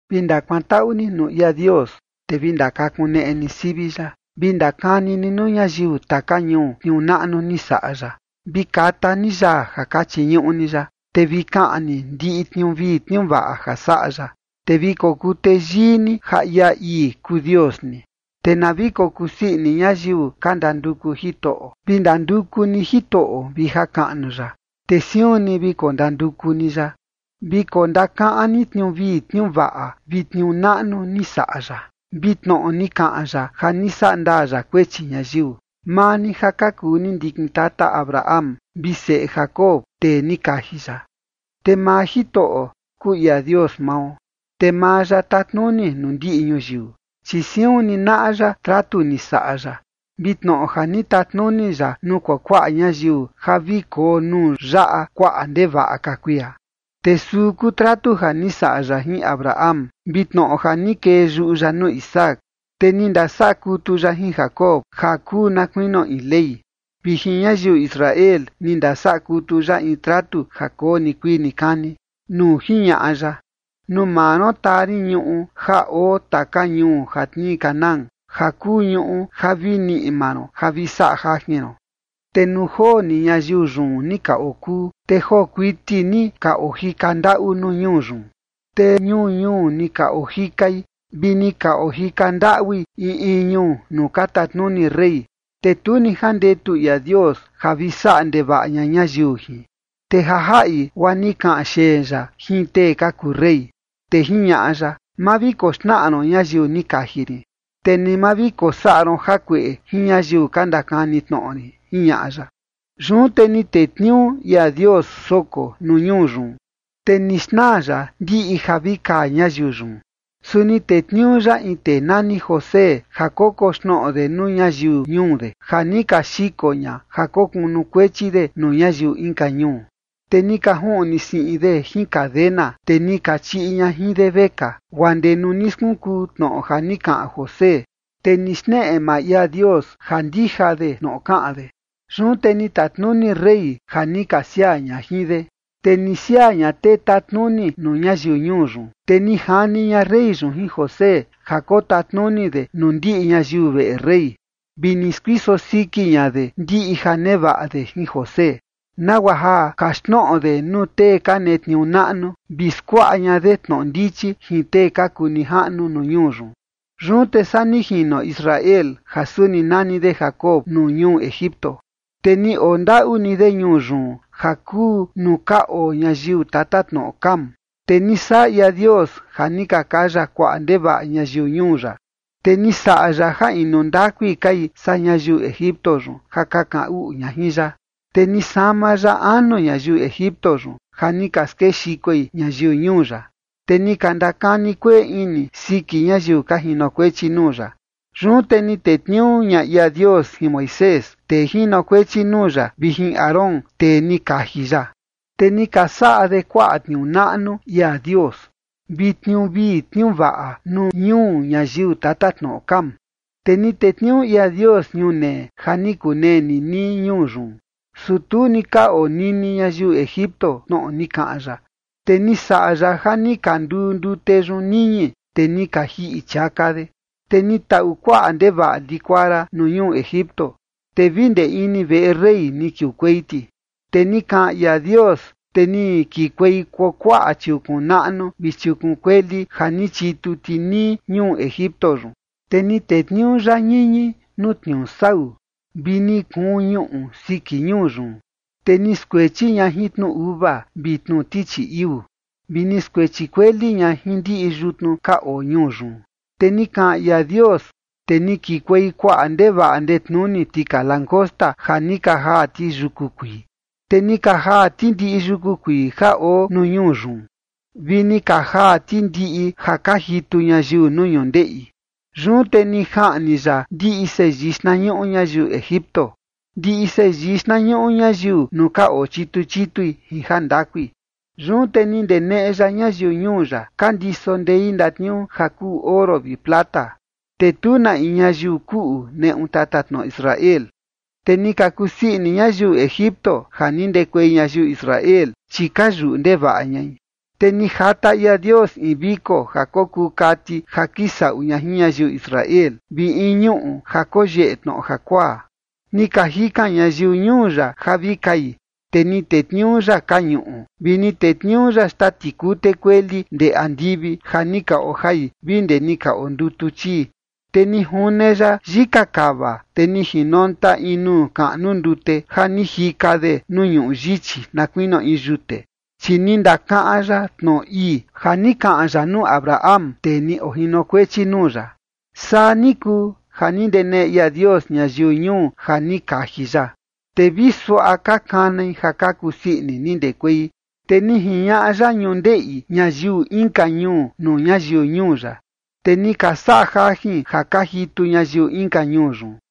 Vi ndakuantaꞌu ni nuu ia Dios, te vi ndakakuneꞌe ni sivi ya. Vi ndakani ni nuu ñayiu taka ñuu tniuu naꞌnu ni saꞌa ya. Vi kata ni yaa ja ka chiñuꞌu ni ya, te vi kaꞌan ni ndiꞌi tniuu vii tniuu vaꞌa ja saꞌa ya. Te vi kokuu teyii ni ja ia ii kuu Dios ni, te na vi kokusii ini ñayiu ka ndanduku Jitoꞌo. Vi ndanduku ni Jitoꞌo vi jakaꞌnu ya, te siun ni vi kondanduku ni ya. Vi kondakaꞌan ni tniuu vii tniuu vaꞌa vi tniuu naꞌnu ni saꞌa ya, vi tnoꞌo ni kaꞌan ya ja ni sandaa ya kuechi ñayiu, maa ni ja ka kuu ni ndikin tata Abraham, vi seꞌe Jacob, tee ni kaji ya. Te maa Jitoꞌo kuu ia Dios mao, te maa ya tatnuni nuu ndiꞌi ñuyiu. Chi siun ni naꞌa ya tratu ni saꞌa ya vi tnoꞌo ja ni tatnuni ya nuu kuakuaꞌa ñayiu ja vi koo nuu yaꞌa kuaꞌa ndevaꞌa ka kuia. Te suu kuu tratu ja ni saꞌa ya jin Abraham vi tnoꞌo ja ni kee yuꞌu ya nuu Isaac. Te ni ndasaꞌa kutu ya jin Jacob ja kuu na kuinio in ley, vi jin ñayiu Israel ni ndasaꞌa kutu ya in tratu ja koo nikuii nikani, nuu jiñaꞌa ya: “Nuu maa ron taa rin ñuꞌu ja oo taka ñuu ja tnii Canaán ja kuu ñuꞌu ja vi niꞌi maa ron ja vi saꞌa jajin ron”. Te nuu joo ni ñayiu yun ni ka okuu, te joo kuiti ni ka ojika ndaꞌu nuu ñuu yun, te ñuu ñuu ni ka ojikai vi ni ka ojika ndaꞌui in in ñuu nuu ka tatnuni rey, te tu ni jandetu ia Dios ja vi saꞌa ndevaꞌa ña ñayiu jin, te ja jaꞌi guaa ni kaꞌan xeen ya jin tee ka kuu rey. Te jiñaꞌa ya: “Ma vi koxnaꞌa ron ñayiu ni kaji rin, te ni ma vi kosaꞌa ron jakueꞌe jin ñayiu ka ndakani tnoꞌo rin”, jiñaꞌa ya. Yun te ni tetniuu ia Dios soko nuu ñuu yun, te ni xnaa ya ndiꞌi ja vi kaa ñayiu yun. Su ni tetniuu ya in tee nani José ja kokoxnoꞌo de nuu ñayiu ñuu de, ja ni ka xiko ña ja kokunukuechi de nuu ñayiu inka ñuu. Te ni ka juꞌni siꞌin de jin cadena, te ni ka chiꞌi ña jin de vekaa, guaa ndee nuu ni skunkuu tnoꞌo ja ni kaꞌan José, te ni xneꞌe maa ia Dios ja ndija de tnoꞌo kaꞌan de. Yun te ni tatnuni rey ja ni ka siaa ña jin de, te ni siaa ña tee tatnuni nuu ñayiu ñuu yun. Te ni jani ña rey yun jin José ja kotatnuni de nuu ndiꞌi ñayiu veꞌe rey, vi ni skuiso siki ña de ndiꞌi ja nevaꞌa de jin José, nagua ja kaxtnoꞌo de nuu tee ka netniuu naꞌnu, vi skuaꞌa ña de tnoꞌo ndichi jin tee ka kuu nijaꞌnu nuu ñuu yun. Yun te saa ni jino Israel ja suni nani de Jacob nuu ñuu Egipto, te ni oo ndaꞌu ni de ñuu yun ja kuu nuu ka oo ñayiu tatatnoꞌo Cam. Te ni saꞌa ia Dios ja ni ka kaya kuaꞌa ndevaꞌa ñayiu ñuu ya, te ni saꞌa ya ja inu ndakui kai saa ñayiu Egipto yun ja ka kaꞌan uꞌu ña jin ya. Te ni sama ya anu ñayiu Egipto yun ja ni ka skexikoi ñayiu ñuu ya, te ni ka ndakani kueꞌe ini siki ñayiu ka jinokuechi nuu ya. Yun te ni tetniuu ña ia Dios jin Moisés, tee jinokuechi nuu ya, vi jin Aarón, tee ni kaji ya. Te ni ka saꞌa de kuaꞌa tniuu naꞌnu ia Dios, vi tniuu vii tniuu vaꞌa nuu ñuu ñayiu tatatnoꞌo Cam. Te ni tetniuu ia Dios ñunee ja ni kunee ninii ñuu yun, su tu ni ka onini ñayiu Egipto tnoꞌo ni kaꞌan ya. Te ni saꞌa ya ja ni ka nduu ndute yun niñi, te ni ka jiꞌi chiaka de. Te ni taꞌu kuaꞌa ndevaꞌa likuara nuu ñuu Egipto, te vi ndee ini veꞌe rey ni kiukuei ti. Te ni kaꞌan ia Dios, te ni kikuei kuakuaꞌa chiukun naꞌnu vi chiukun kueli ja ni chitu ti nii ñuu Egipto yun. Te ni tetniuu ya ñiñi nuu tniuu sau, vi ni kuun ñuꞌu siki ñuu yun. Te ni skuechi ña jin tnu uva vi tnu tichi iuu, vi ni skuechi kueli ña jin ndiꞌi yutnu ka oo ñuu yun. Te ni kaꞌan ia Dios, te ni kikuei kuaꞌa ndevaꞌa ndetnuni tika langosta, ja ni ka jaa ti yuku kuii. Te ni ka jaa ti ndiꞌi yuku kuii ja oo nuu ñuu yun, vi ni ka jaa ti ndiꞌi ja ka jitu ñayiu nuu ñundeꞌi. Yun te ni jaꞌni ya ndiꞌi seyii xtnañuꞌu ñayiu Egipto, ndiꞌi seyii xtnañuꞌu ñayiu nuu ka ochitu chitui jin jandakui. Yun te ni ndeneꞌe ya ñayiu ñuu ya ka ndiso ndei ndatniuu ja kuu oro vi plata, te tu na in ñayiu kuꞌu neꞌu tatatnoꞌo Israel. Te ni ka kusii ini ñayiu Egipto ja ni ndekuei ñayiu Israel, chi ka yuꞌu ndevaꞌa ñai. Te ni jata ia Dios in viko ja kokuu kati ja kisaꞌu ña jin ñayiu Israel, vi in ñuꞌu ja koyeꞌe tnoꞌo jakuaa. Ni ka jikan ñayiu ñuu ya ja vi kai, te ni tetniuu ya kañuꞌu, vi ni tetniuu ya xtaa tikute kueli ndee andivi ja ni ka ojai vi ndee ni ka ondutu chii. Te ni june ya yika kava, te ni jinonta in nuu kaꞌnu ndute, ja ni jika de nuu ñuꞌu yichi, na kuinio in yute. Chi ni ndakaꞌan ya tnoꞌo ii, ja ni kaꞌan ya nuu Abraham, tee ni ojinokuechi nuu ya. Saa ni kuu ja ni ndeneꞌe ia Dios ñayiu ñuu ja ni kaji ya, te vi suaꞌa ka kanai ja ka kusii ini ni ndekuei. Te ni jiñaꞌa ya ñundeꞌi ñayiu inka ñuu nuu ñayiu ñuu ya, te ni ka saꞌa jajin ja ka jitu ñayiu inka ñuu yun,